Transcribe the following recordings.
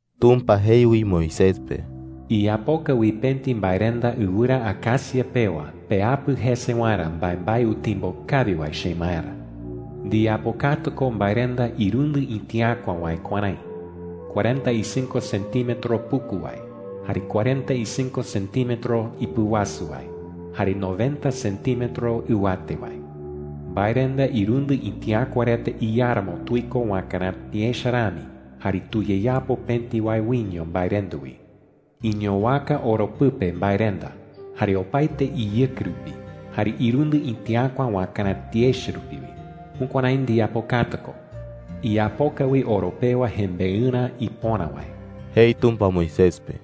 Tumpa jei wi Moisés pe: “Iyapoka wi pëti mbaerenda ɨwɨra acacia pewa peapɨ jese waerä mbaembae utimbo kawi wae chemaerä,” jei. “Ndiyapokata ko mbaerenda irundɨ itiäkua wae kuärái: cuarenta y cinco centímetro puku wae, jare cuarenta y cinco centímetro ipɨwasu wae, jare noventa centímetro ɨwate wae,” jei. “Mbaerenda irundɨ itiäkua reta iáramo tuiko wakaräti echa rami, jare tuyeyapo pëti wae wiño mbaerenda wi. Iñowaka oro pɨpe mbaerenda, jare opaete iyɨke rupi, jare irundɨ itiäkua wakaräti echa rupi wi. Jukuärái ndiyapokata ko. Iyapoka wi oro pewa jembeɨrä ipöra wae,” jei Tumpa Moisés pe. (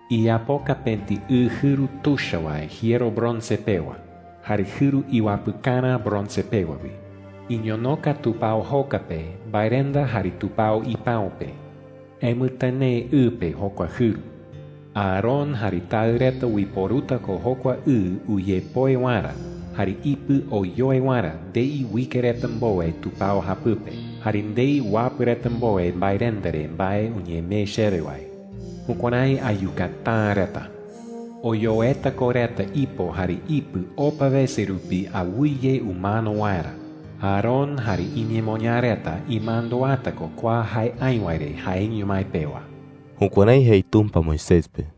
“Iyapoka pëti ɨ jɨru tuicha wae jiero bronce pewa, jare jɨru iwapɨkarä bronce pewa wi,” jei. “Iñonoka tupao joka pe, mbaerenda jare tupao ipäu pe. Emɨtɨnee ɨ pe jokua jɨru. Aarón jare taɨ reta uiporuta ko jokua ɨ uyepoe waerä jare ipɨ oyoe waerä ndei uike reta mbowe tupao japɨpe, jare ndei uapɨ reta mbowe mbaerenda re mbae uñemee chewe wae. Jukuärái ayukata’ä reta. Oyoeta ko reta ipo jare ipɨ opa wese rupi awɨye umano waerä. Aarón jare iñemoñaa reta imanduata ko kua jae aï wae re jaeño mái pewa.” Jukuärái jei Tumpa Moisés pe.